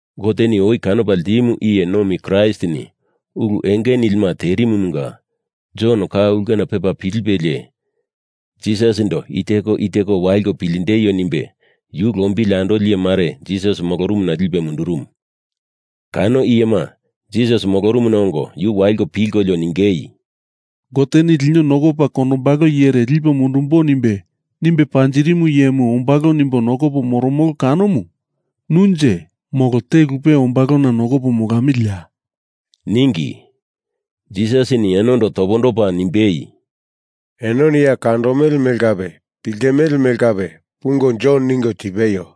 Goteni oi kanopa ltimu iye nomi Kraistini ulu enge nilima terimumunga Jon ka ulkena pepa pilipelie, Jisasindo i teko i teko waliko piltindeio nimbe yu lombili andoli iye mare Jisas molorumuna lipe mundurumu. Kano iyema Jisas molorumuna ongo yu waliko pilkolio ningei, “Goteni lino nokopa kondombalo iyere lipo mundumbo nimbe, nimbe panjirimu iyemu ombalo nimbo nokopo moromolo kanomu nunje molo te lupe ombalona nokopo molamiliya?” ningi. Jisasini enondo topondopa nimbei, “Enoni ya kandomele mele kape piltimele mele kape pungo Jon ningo tipeio.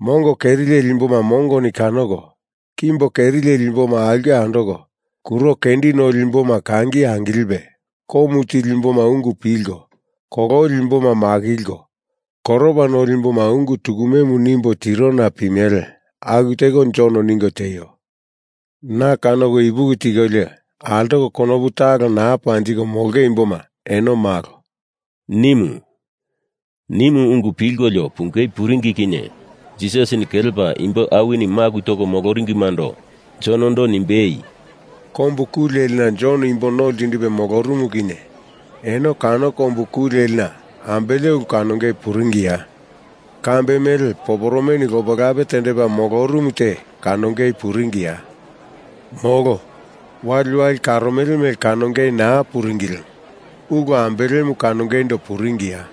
Mongo keri leli imboma mongoni kanoko, kimbo keri leli imboma aulke andoko, kuro kendi nolima imbo kangi angilipe, komu tili imboma ungu pilko, kololi imboma makilko, koropa noli imboma ungu tukumemu nimbo tirona pimele. Aku teko Jon ningo tieio. Na kanoko ipuki tikolio, altoko konopu talo naa panjiko molonge imboma eno malo,” nimu. Nimu ungu pilkolio pungei puringi kinye Jisasini kelepa imbo awini maku toko moloringimando Jonondo nimbei, “Kombu ku lelina Jon imbo no ltindipe molorumu kinye eno kano kombu ku lelina ambele ulu kanongei puringiya? Kambe mele poporomeni lope lape tendepa molorumu te kanongei puringiya? Molo. Waliwali karomele mele kanongei naa puringi lemo ulu ambelemu kanongeindo puringiya?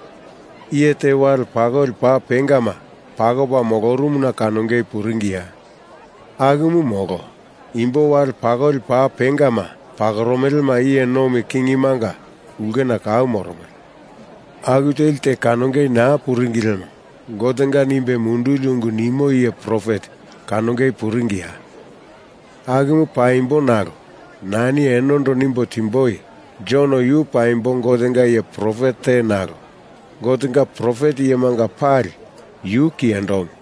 Iye te wale pakoli paa pengama pakopa molorumuna kanongei puringiya? Akumu molo. Imbo wale pakoli paa pengama pakoromelema iye nomi kingimanga ulkena kau moromele. Aku teli te kanongei naa puringi lemo Gotenga nimbe munduli ungu nimo iye profet kanongei puringiya? Akumu paimbo nalo nani enondo nimbo timboi, Jon yu paimbo Gotenga iye profet te nalo Gotenga profet iyemanga pali yu kiyendomu.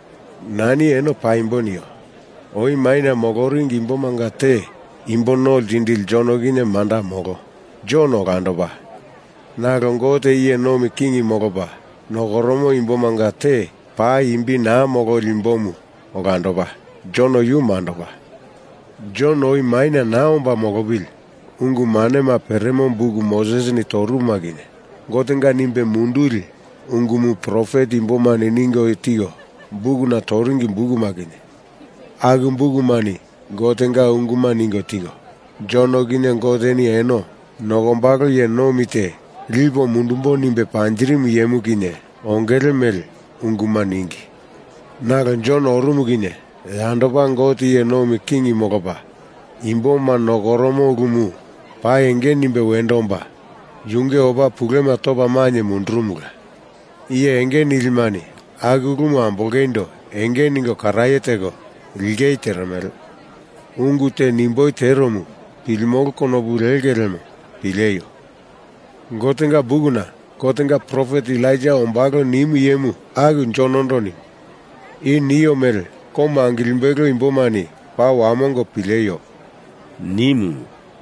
Nani eno paimbo nio. Oi maina moloringi imbomanga te Imbo No Ltindili Jon kinye, manda molo. Jon olandopa. Nalo Gote iye nomi king molopa nokoromo imbomanga te paa imbi naa mololi imbomu olandopa; Jon yu mandopa. Jon oi maina naa omba molopili ungu manema peremo buk Mosesini torumuma kinye, Gotenga nimbe munduli ungumu profet imbomani ningo tiko bukuna toringi bukuma kinye, aku bukumani Gotenga unguma ningo tiko, Jon kinye Goteni eno nokombalo iye nomi te lipo mundumbo nimbe panjirimu iyemu kinye ongele mele unguma ningi. Nalo Jon orumu kinye yandopa Gote iye nomi king molopa imboma nokoromo ulumu paa enge nimbe wendo omba yunge opa pulema topa mainye mundurumola. Iye enge nilimani aku ulumu ambolongeindo enge ningo karaye teko lingei teremele. Ungu te nimboi teromu pilimolo konopu linge lemo pileio! Gotenga bukuna Gotenga profet Elaija ombalo nimu iyemu aku Jonondo nimu. I nio mele komu angilimbelo imbomani paa wamongo pileio!” nimu.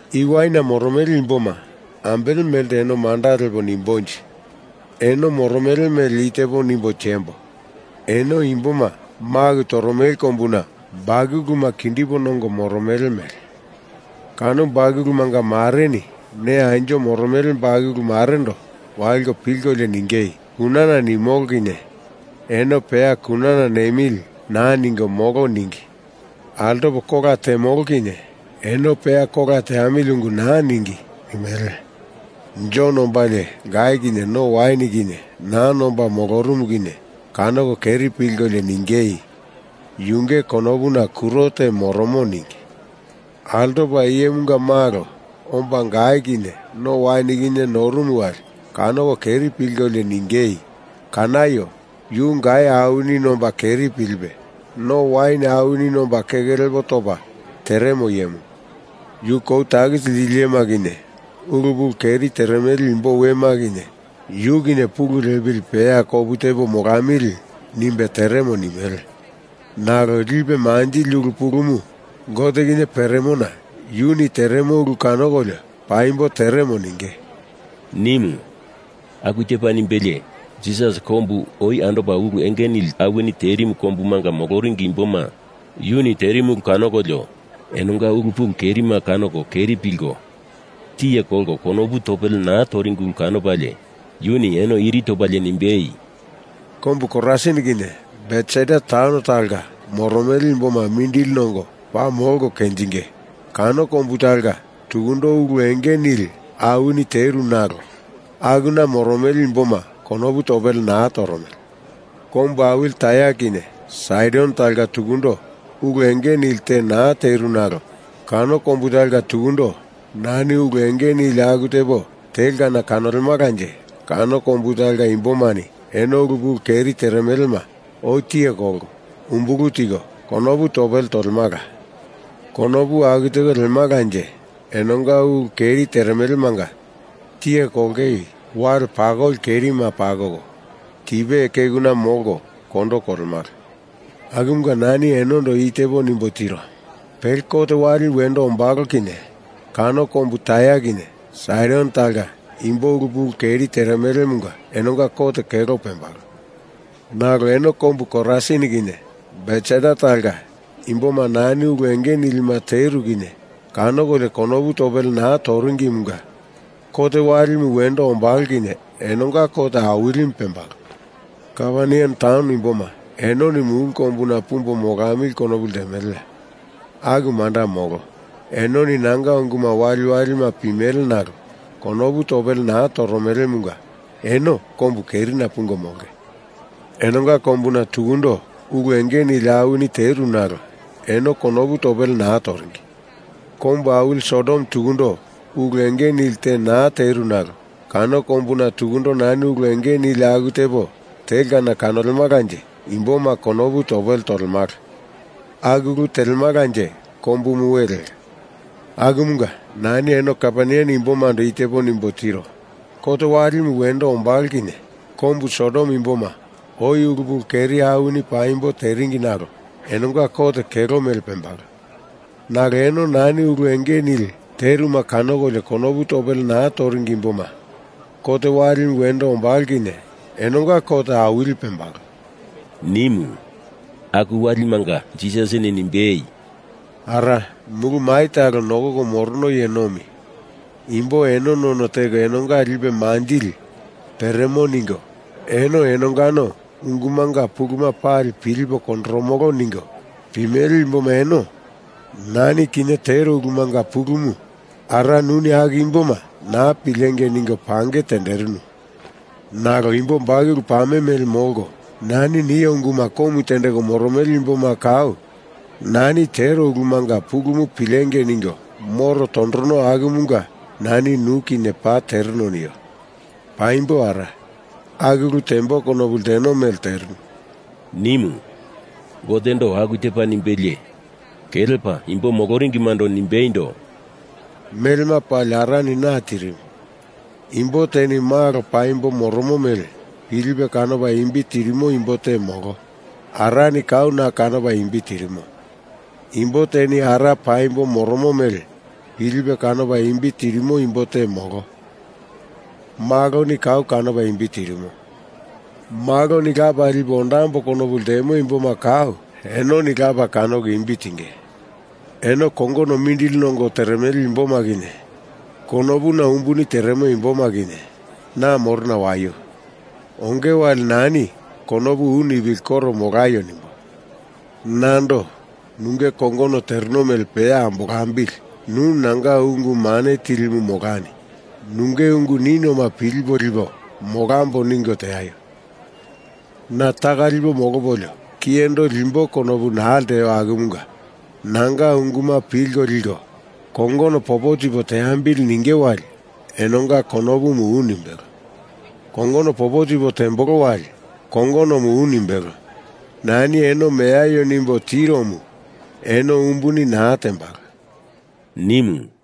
“I waina moromele imboma ambele melte eno manda lepo nimbonje? Eno moromele mele i tepo nimbo tiembo. Eno imboma maku toromele kombuna bakuluma kindipo nongo moromele mele. Kano bakulumanga mareni ne anjo moromele bakulu marendo waliko pilkolio ningei, ‘Kunana nimolo kinye eno peya kunana nemili naa ningo molo ningi. Altopo kola temolo kinye eno peya kola teamili ungu naa ningi,’ nimele. Jon ombalie gai kinye no wain kinye naa nomba molorumu kinye kanoko keri pilkolio ningei, ‘Yunge konopuna kuro te moromo,’ ningi. Altopa Iyemunga Malo omba gai kinye no wain kinye norumu wali kanoko keri pilkolio ningei, ‘Kanaio! Yu gai awini nomba keri pilipe, no wain awini nomba keke lepo topa teremo iyemu. Yu kou takisi lili iyema kinye, ulu pulu keri teremele imbo wema kinye yu kinye pulu lepili peya kopu tepo molamili nimbe teremo,’ nimele. Nalo lipe manjili ulu pulumu Gote kinye peremona yuni teremo ulu kanokolio paimbo teremo ninge,” nimu. Aku tepa nimbelie Jisas kombu oi andopa ulu enge nili awini terimu kombumanga moloringi imboma yuni terimu ulu kanokolio enonga ulu pulu kerima kanoko keri pilko tiye kolko konopu topele naa toringi ulu kanopalie yuni eno iri topalie nimbei, “Kombu Korasin kinye Betsaida taun talonga moromele imboma mindili nongo paa molko kenjinge! Kano kombu talonga tukundo ulu enge nili awini teru nalo akuna moromele imboma konopu topele naa toromele. Kombu awili Tair kinye Saidon talonga tukundo ulu enge nili te naa teru nalo kano kombu talonga tukundo nani ulu enge nili aku tepo telkana kanolemalanje kano kombu talonga imbomani eno ulu pulu keri teremelema oi tiye kolko, umbulu tiko, konopu topele tolemala. Konopu aku teko lelemalanje enonga ulu keri teremelemanga tiye kolongei wali pakoli kerima pakoko tipe kekuna molko kondo kolemala. Akumunga nani enondo i tepo nimbo tiro. Pele kot walimu wendo ombalo kinye kano kombu Tair kinye Saidon talonga imboma ulu pulu keri teremelemunga enonga kot kelo pembalo. Nalo eno kombu Korasin kinye Betsaida talonga imboma nani ulu enge nilima teru kinye kanokolio konopu topele naa toringimunga kot walimu wendo ombalo kinye enonga kot awilimu pembalo. Kaperneam taun imboma enoni mulu kombuna pumbo molamili konopu ltemeleya? Aku manda molo. Enoni nanga unguma waliwalima pimele nalo konopu topele naa toromelemunga eno kombu kerina pungo molonge. Enonga kombuna tukundo ulu enge nili awini teru nalo eno konopu topele naa toringi. Kombu awili Sodom tukundo ulu enge nili te naa teru nalo kano kombuna tukundo nani ulu enge nili aku tepo telkana kanolemalanje imboma konopu topele tolemala. Aku ulu telemalanje kombumu we leka. Akumunga nani eno Kaperneam imbomando i tepo nimbo tiro. Kot walimu wendo ombalo kinye kombu Sodom imboma oi ulu pulu keri awini paimbo teringi nalo enonga kot kelo mele pembalo. Nalo eno nani ulu enge nili teruma kanokolio konopu topele naa toringi imboma, kot walimu wendo ombalo kinye enonga kot awili pembalo,” nimu. Aku walimanga Jisasini nimbei, “Ara, Mulu Mai talo Nokoko Morono Iye Nomi, imbo eno none teko enonga lipe manjili peremo ningo eno enongano ungumanga puluma pali pilipo kondoromolo ningo pimele imboma eno nani kinye tero ulumanga pulumu Ara nuni aku imboma naa pilengei ningo pange tenderinu. Nalo imbo bakulu pame mele molko nani nio unguma komu tendeko moromele imboma kau nani tero ulumanga pulumu pilengei ningo moro tondorono akumunga nani nu kinye paa tereno nio. Paimbo Ara, aku ulu tembo konopu lteno mele terinu,” nimu. Gotendo aku tepa nimbelie kelepa imbo moloringimando nimbeindo, “Melema pali Arani na tirimu. Imbo teni Malo paimbo moromo mele pilipe kanopa imbi tirimo imbo te molo. Arani kau na kanopa imbi tirimo. Imbo teni Ara paimbo moromo mele pilipe kanopa imbi tirimo imbo te molo. Maloni kau kanopa imbi tirimo. Maloni Lapa lipo ondambo konopu ltemo imboma kau enoni Lapa kanoko imbi tinge. Eno kongono mindili nongo teremele imboma kinye, konopuna umbuni teremo imboma kinye, na morona waio. Onge wali nani konopu u nipili koro molaio nimbo. Nando, nunge kongono tereno mele peya ambolambili, nu nanga ungu mane tilimu molani, nunge ungu ninioma pilipo lipo molambo ningo teaio. Na taka lipo molopolio kiyendo limbo konopu naa lteo akumunga nanga unguma pilko liko kongono popo tipo teambili ninge wali enonga konopumu u nimbelo. Kongono popo tipo tembolo wali kongonomu u nimbelo. Nani eno meaio nimbo tiromu eno umbuni naa tembalo,” nimu.